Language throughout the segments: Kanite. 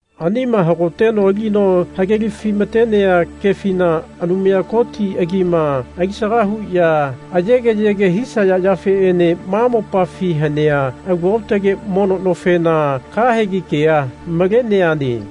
Anima hagoteno alino hagelafi-matenea kefina Anumaya Koti agima alisaga huya ayegeyege hisaya yafeene ma mopafi hanea alu aotage mono nofena kahegi kea maleneane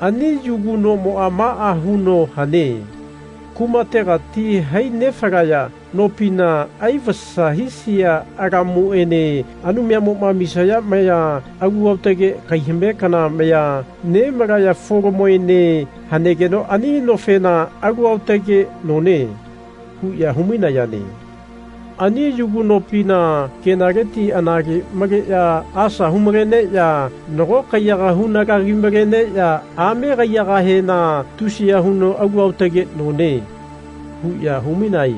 Ani yugu nomoa maa huno hane. Kumategati hai nefalaya nopina aivasa hisia alamuene Anumayamoma amisaya maya alu aotage kaihame kana maya nemalaya folamoene hanegeno ani nofena Alu aotage none. huya hu-mainayane. Ani yugu nopina kenaleti anale maleya asa hu-maleneya nago kaiyaga hunalagi-maleneya ame kaiyagahena Tusiya huno alu aotage none. huya humainae.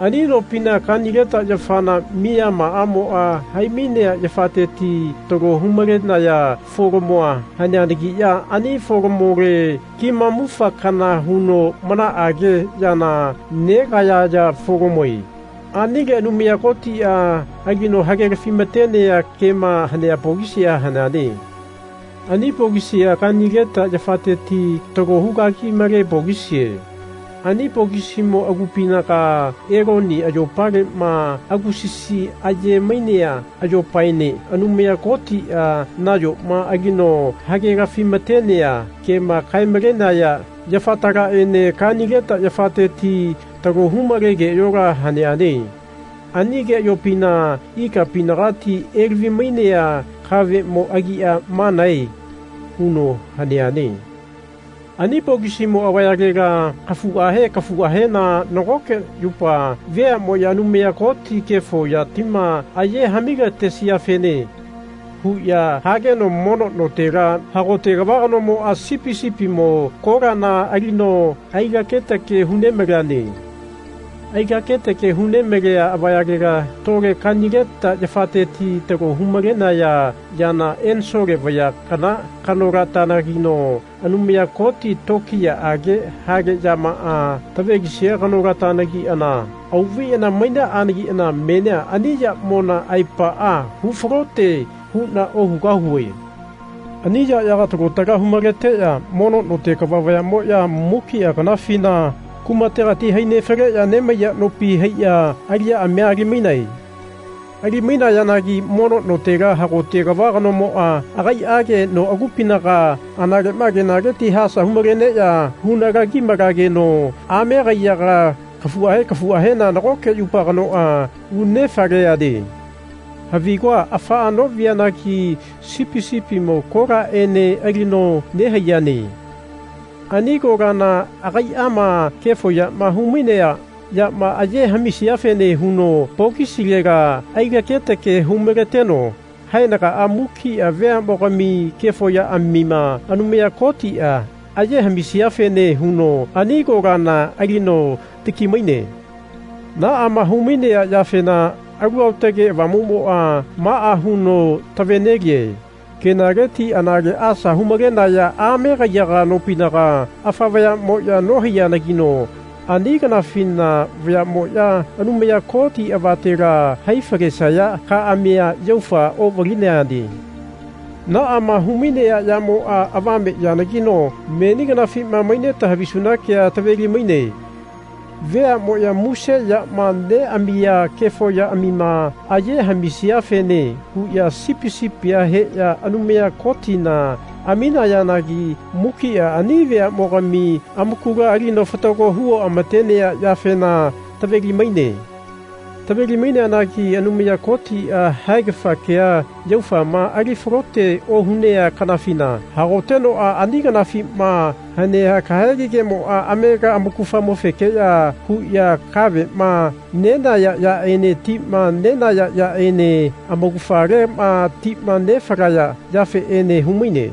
Ani nopina kanileta yafana miyamaamoa hai-mainea yafateti talo hu-malenaya folamoa haneanagiya ani folamole kimamufa kana huno manaage yana negayaya folamoe. Anile Anumaya Kotia alino hagelafi-matenea kema hanea pokisia haneane. Ani pokisia kanileta yafateti talo hugagi-male pokisie. Ani pokisimo agupinaga Eloni ayopalema agusasi aye-mainea ayopaene Anumaya Kotia nayoma alino hagelafi-matenea kema kae-malenaya yafatalaene kanileta yafateti talo humale keayola haneane. Ani keayopina ikapinagati elavi-mainea kavemo agia manae huno haneane. Ani pokisimo avayalela kafuahe kafuahena nagoke yupa veamoya Anumaya Kotia kefo yatima aye hami-latesiafene. huya hageno mono notela hagote kava kanomoa sipi sipimo kolana alino ailake-take hunemaleane. Ai-laketake hu nemalea avayalela tole kanileta yafateti talo hu-malenaya yana ensole vaya kana kanolatanagino Anumaya Koti tokiyaage hale yamaa tavelisia kanolatanagiana auvaiana mainaanagina menia ani yamona aepaa hufalote huna ohugahue. Ani yayaga talo tala hu-maleteya mono note kava vayamoya mukia kanafina kumategati hai nefaleya nemaiya nopi haiya aliyaamia alimainae. Alimainayanagi mono notela hagote kava kanomoa agaiage noagupinaga analema kenaleti asa hu-maleneya hunalagi-malageno ame kaiyaga kafuahe kafuahena nagoke yupa kanoa unefaleane. Havigua afaa novianagi sipi sipimo kolaene alino nehaiyane. Ani kolana agaiama kefo yama humainea yama aye hamisiafene huno pokisilela ailake-take hu-maleteno haenaga mukia veamogami kefo yaamima Anumaya Kotia aye hami-talesiafene huno ani kolana alino taki-maine. Naama hu-mainea yafena Alu Aotage Avamumoa maa huno tave-nelie kenaleti anale asa hu-maleneya ame kaiyaga nopinaga afa vayamoya nohaiyanagino ani kanafina vayamoya Anumaya Koti avatela hai-falesaya kaamia yaufa ovalineane. Naama humainea yamoa avame yanagino meni kanafima maineta havisuna kea taveli-maine. Veamoya muse yama neamiya kefo yaamima aye hami-talesiafene huya sipi sipia heya Anumaya Kotina aminayanagi mukia ani veamogami amakula alino fatago hu oamatenea yafena taveli-maine. Taveli-maineanagi Anumaya Kotia haegafa kea yaufama ali falote ohunea kanafina hagotenoa ani kanafima hanea kahegi kemoa amega amaugafamofekeya huya kavema nenaya yaene tima nenaya yaene amaugafalema tima nefalaya yafeene humaine.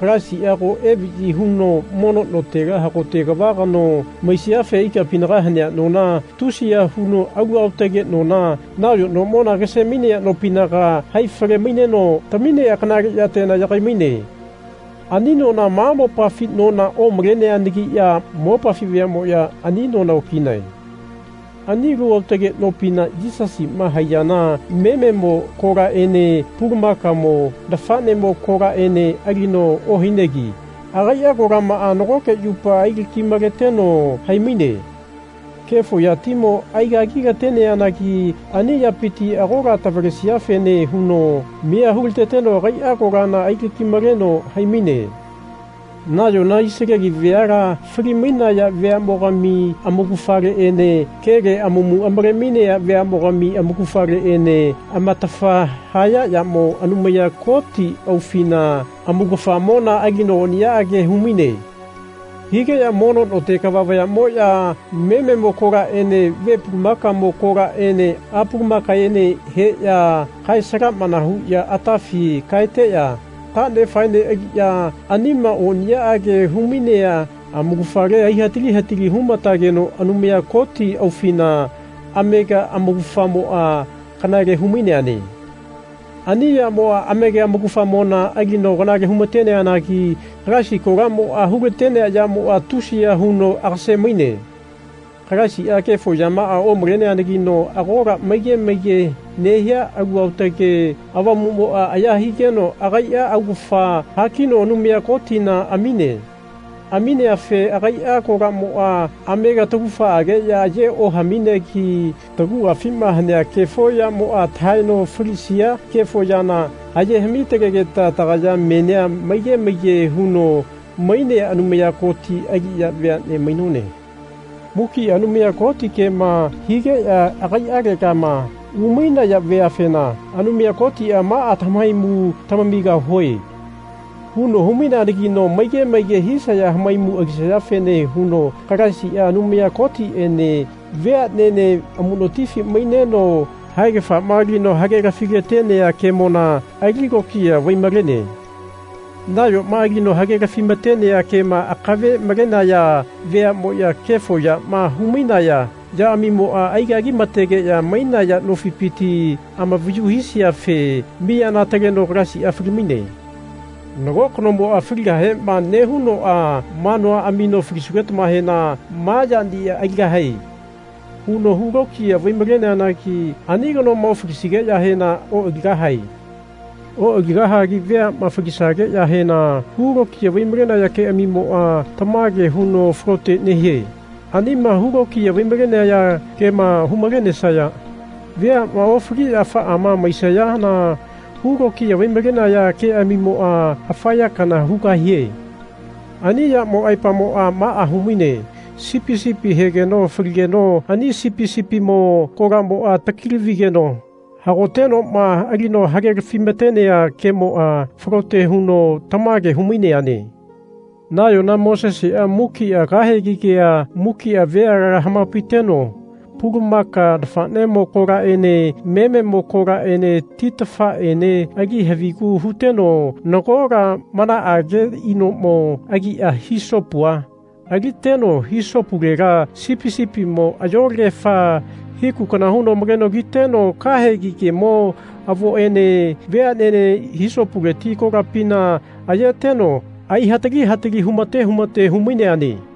Kalaisia ago evayi huno mono notela hagote kava kano maisiafe ikapinaga hanea nona, tusiya huno alu aotage nona, nayo nomona agase-mainea nopinaga, haifale-maineno taminea kanale yatela yagai-maine. Ani nona ma mopafi nona omaleneanagiya mopafi vayamoya ani nona okinae. Ani alu aotage nopina Yisasima haiyana mememo kolaene pulamaka nafanemo kolaene alino ohainegi agaia kolamaa nagoke yupa ailaki-maleteno hai-maine. Kefo yatimo aigagi-lateneanagi ani yapiti agola tavalesiafene huno miya hulateteno agaia kolana ailaki-maleno hai-maine. Nayona Isaleli veala fali-mainaya veamogami amaugafaleene kele amamu amale-mainea veamogami amaugafaleene amatafa haya yamo Anumaya Koti aufina amaugafamona alino oniyaage humainae. Higeya mono note kava vayamoya mememo kolaene ve pulamakamo kolaene a pulamakaene heya kae-salamana huya atafi kaeteya tanefaene aliya anima oniyaage humainea amaugafale aihatali hatali humatageno Anumaya Koti aufina amega amaugafamoa kanale hu-maineane. Ani yamoa amega amaugafamona alino kanale humateanagi Kalaisi kolamoa hulatenea yanagino tusiya huno agase-maine. Kalaisia kefo yamaa omaleneanagino agola maige maige nehia Alu Aotage Avamumoa aya higeno agaia augafa hakino Anumaya Kotina amine. Amineafe agaia kolamoa amega taugafaageya aye ohaminegi taguafima hanea kefo yamoa tahaeno falilatesia kefo yana, aye hami-talegeta tagaya menia maige maige huno mainea Anumaya Koti aliya veane mainone. Mukia Anumaya Kotia kema higeya agaialegama umainaya veafena Anumaya Kotia Maa tamahaimu tamamigahue. huno hu-maineanagino maige maige hisaya hamaimu alisayafene huno Kalaisia Anumaya Kotiene veanene amunotifi maineno haegafama alino hagelafila-tenea kemona ali lokiya vai-malene. Nayoma alino hagelafi-matenea kema akave malenaya veamoya kefo yama hu-mainaya yaamimoa aigagimategeya mainaya nofipiti amavayu hisiafe miyana ataleno Kalaisia fali-maine. Nago kanomoa faligahema nehunoa manua amino Falisugetamahena ma yania aligahae. huno hu lokiya vai-maleneanagi ani kanoma ofalisigeyahena oaligahae. Oaligahagi veama falisageyahena hu lokiya vai-malenaya keamimoa tamage huno falote nehie. Anima hu lokiya vai-malenaya kema humalenesaya veama ofaliya afaama maisayana hu lokiya vai-malenaya keamimoa afa ya kana hugahie. Ani yamo aepamoa maa humaine sipi sipia hegeno faligeno ani sipi sipimo kolamoa taki-lavigeno hagotenoma alino hagelafi-matenea kemoa falote huno tamage hu-maineane. Nayona Mosesea mukia kahegi kea mukia veala hamapaiteno pulamaka nafanemo kolaene mememo kolaene titafaene ali havigu huteno nagola manaage inomo agia hisopua aliteno hisopulela sipi sipimo ayolagefa hiku kana huno maleno kiteno kahegi kemo avoene veanene hisopuleti kolapina ayeteno aihatali hatali humate humate hu-maineane.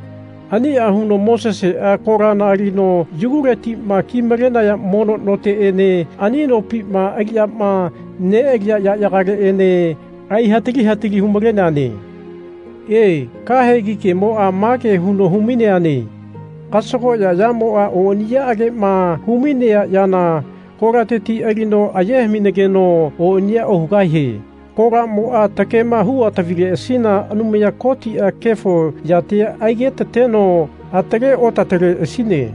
Ania huno Mosesea kolana alino yuguletima kimale mono noteene ani nopima aliyama nealiya yayagaleene aihatali hatali hu-maleneane. E, kahegi kemoa mage huno hu-maineane Kasagoya yamoa oniyaagema humainea yana kolateti alino aye haminageno oniya ohugahie. Kolamoa takema hu otavineleasina Anumaya Kotia kefo yatia aigetateno atale oatateleasine.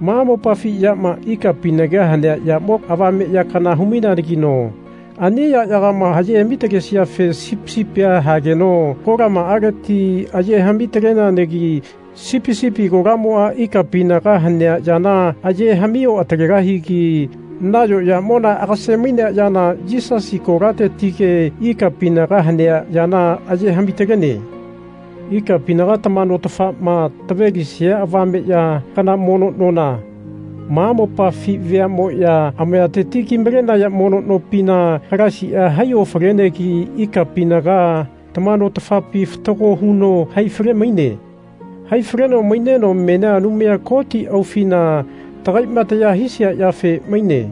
Ma mopafi yama ikapinaga hanea yamo avame ya kana hu-maineanagino ani yayagama aye hami-talesiafe sipi sipia hageno kolamaaleti aye hami-taleneanagi sipi sipi kolamoa ikapinaga hanea yana aye hami oatalegahigi nayo yamona agase-mainea yana Yisasi kolatetike ikapinaga hanea yana aye hami-talene. Ikapinaga tama notafama tavelisia avame ya kana mono nona, ma mopafi veamoya amayateti kimalenaya mono nopina Kalaisia hai ofalenegi ikapinaga tama notafapi fatago huno hai fale-maine. Hai faleno maineno menia Anumaya Koti aufina tagaima taya hisia yafe maine.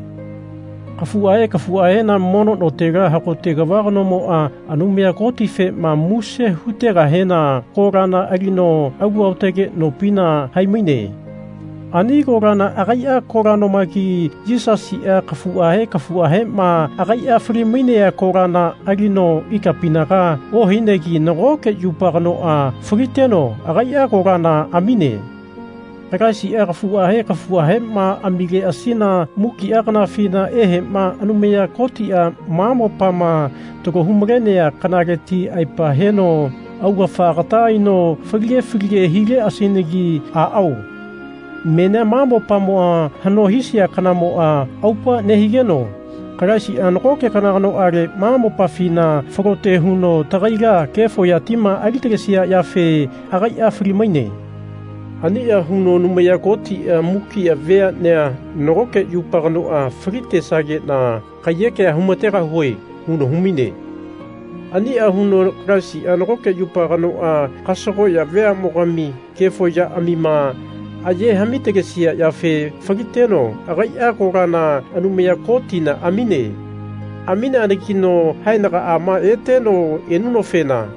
Kafuahe kafuahena mono notela hagote kava kanomoa Anumaya Kotifema muse hutegahena kolana alino alu aotage nopina hai-maine. Ani kolana agaia kola nomagi Yisasia kafuahe kafuahema agaia fali-mainea kolana alino ikapinaga ohainegi nagoke yupa kanoa faliteno agaia kolana amine. Kalaisia kafuahe kafuahema amileasina mukia kanafina ehema Anumaya Kotia ma mopama talo humalenea kanaleti aepa heno augafa agata aino falige falige hileasinagi. Aao menia ma mopama hano hisia kanamoa aupa nehigeno Kalaisia nagoke kana kanoale ma mopafina falote huno tagaila kefo yatima ali-talesia yafe agaia fali-maine. Ania huno Anumaya Kotia Mukia veanea nagoke yupa kanoa falitesagena kaiyekea humategahue. huno humaine. Ania huno Kalaisia nagoke yupa kanoa kasagoya veamogami kefo yaamima aye hami-talesia yafe faliteno agaia kolana Anumaya Kotina amine. Amineanagino haenagaama eteno enunofena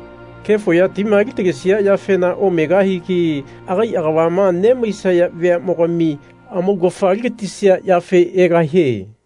kefo yatima ali-talesia yafena omegahigi agai agavama nemaisaya veamogami amaugafa aligatisia yafe egahie.